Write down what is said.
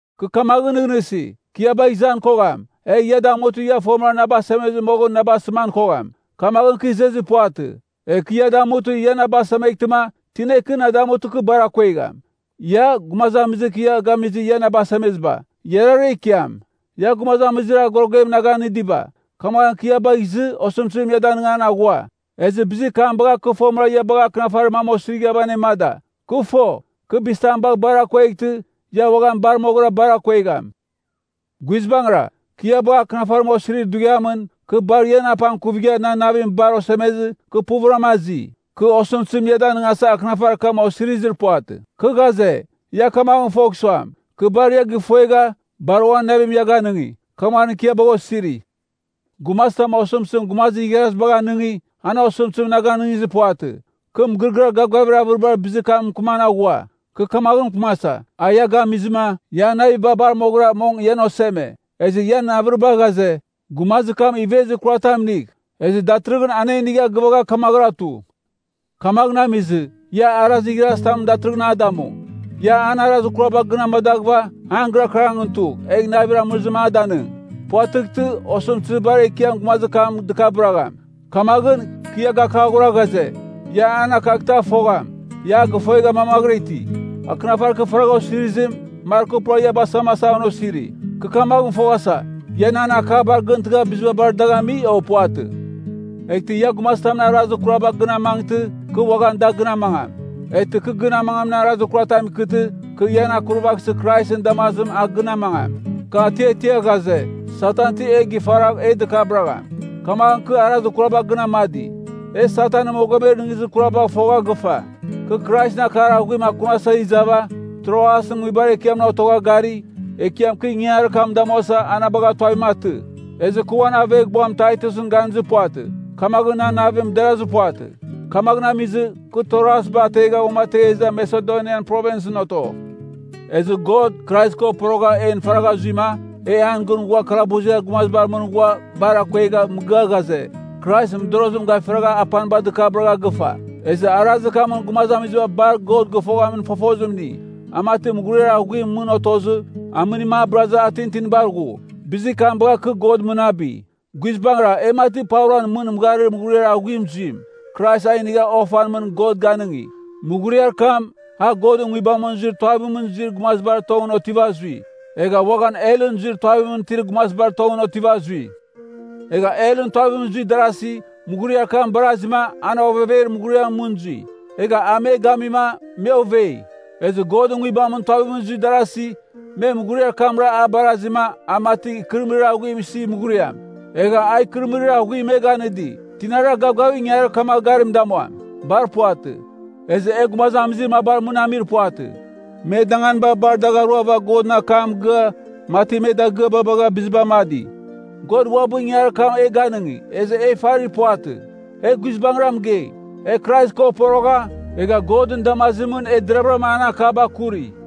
Kɨ kamaghɨn nɨghnɨsi, kɨ ia bagh izan kogham, egh ia damutɨ ia fomɨra na basemezɨ moghɨn na basɨman kogham. Kamaghɨn kɨ izezir puvatɨ. Egh kɨ ia damutɨ, ia na basemeghtɨma, tina ikɨ na damutɨ kɨ bar akuegham? Ia, gumazamizir kɨ ia gamizɨ ia na basemeziba, iarara ikiam. Ia gumazamizir agorogem na ganɨdiba, kamaghɨn kɨ ia bagh izɨ osɨmtɨzim ia danɨngan aghua. Ezɨ bizir kam bagha kɨ fomɨra ia bagha akɨnafarir mam osirighava anemada. Kɨ fo, kɨ bizitam bagh bar akueghtɨ, ia uaghan bar moghɨra bar akuegham. Guizbangɨra, kɨ ia bagha akɨnafarim osirir dughiamɨn, kɨ bar ian apangkuvigha, nan navim bar osemezɨ, kɨ puvɨram azi. Kɨ osɨmtɨzim ia danɨngasa akɨnafarir kam osirizir puvatɨ. Kɨ ghaze, ia kamaghɨn fogh suam, kɨ bar ia gifuegha, bar uan navim ia ganɨngi. Kamaghɨn kɨ ia bagha osiri. Gumazitam osɨmtɨzim gumazir igharazibagh anɨngi, an osɨmtɨzim na ganɨngizir puvatɨ. Kɨ mɨgɨrɨgɨar gavgavir avɨribar bizir kam mɨkɨman aghua. Kɨ kamaghɨn mɨkɨmasa, a ia gamizɨma, ian naviba bar moghɨra, mong ian oseme. Ezɨ ian avɨriba ghaze, gumazir kam a ivezir kurar tam inigh. Ezɨ datɨrɨghɨn anenigha gɨvagha, kamaghɨra tu. Kamaghɨn amizɨ, ia arazir igharazitamɨn datɨrɨghɨn a damu. Ia an arazir kuraba gɨn amadaghɨva, an gɨrakɨrangɨn tugh, egh navir amɨrɨzim a danɨng. Puvatɨghtɨ, osɨmtɨzir bar ekiam gumazir kam dɨkabɨragham. Kamaghɨn, kɨ ia gakaghora ghaze, ia an akaghtɨ a fogham, ia a gifuegha mamaghɨra iti. Akɨnafarir kɨ faragha osirizim, mar kɨ pura ia basamasa an osiri. Kɨ kamaghɨn foghasa, ia nan akabar gɨntɨgha biziba bar dagh ami, o puvatɨ? Eghtɨ ia gumazitamɨn arazir kuraba gɨn amangtɨ, kɨ uaghan da gɨn amangam. Eghtɨ kɨ gɨn amangamin arazir kuratam ikɨtɨ, kɨ ian akurvaghsɨ Kraisɨn damazim a gɨn amangam. Kɨ atiatia ghaze, Satan ti e gifaragh e dɨkabɨragham. Kamaghɨn kɨ arazir kuraba gɨn amadi. E Satanɨn mogomer nɨghnɨzir kurabagh fogha gɨfa. Kɨ Kraisɨn akar aghuim akunasa izava, Troasɨn nguibar ekiamɨn otogha gari, Ekiam kɨ ingangarir kam damuasa, a na bagha tuavim atɨ. Ezɨ kɨ uan aveghbuam Taitusɨn ganizir puvatɨ. Kamaghɨn nan navim derazir puvatɨ. Kamaghɨn amizɨ, kɨ Troasba ategha uamategha iza Masedonian Provinsɨn oto. Ezɨ God, Krais ko porogha en faragha zuima, e an gɨn ghua kalabuziar gumazibar mɨn ghua bar akuegha mɨgɨa ghaze, Krais modorozim gafiragha apaniba dɨkabɨragha gɨfa! Ezɨ arazir kamɨn gumazamiziba bar God gɨfoghamin fofozim ini. A mati mughuriar aghuimɨn mɨn otozɨ, amɨnim a bɨrazɨ a tintinibar ghu. Bizir kam bagha kɨ Godɨn mɨnabi. Guizbangɨra, e mati pauran mɨn mɨgharir mughuriar aghuim zuim, Krais a inigha ofan mɨn God ganɨngi. Mughuriar kam, a Godɨn Nguibamɨn zuir tuavimɨn zuir gumazibar tongɨn otiva zui. Egha uaghan helɨn zuir tuavimɨn itir gumazibar tongɨn otiva zui. Egha helɨn tuavimɨn zuir darasi, mughuriar kam barazima, an ovever mughuriamɨn mɨn zui. Egha a me gamima, me ovei. Ezɨ Godɨn Nguibamɨn tuavimɨn zuir darasi, me mughuriar kamra a barazima, a mati ikɨrɨmɨrir aghuim isi mughuriam. Egha a ikɨrɨmɨrir aghuim me ganɨdi. Tinara gavgavigh ingangarir kamagh garim damuam? Bar puvatɨ. Ezɨ e gumazamizir mabar mɨn amir puvatɨ, me danganiba bar dagh aruava Godɨn akam mɨgɨa, mati me dagɨaba bagha biziba amadi. God uabɨ ingangarir kam e ganɨngi, ezɨ e ifarir puvatɨ, e guizbangɨra mɨgei. E Krais ko porogha, egha Godɨn damazimɨn e deravɨram an akaba akuri.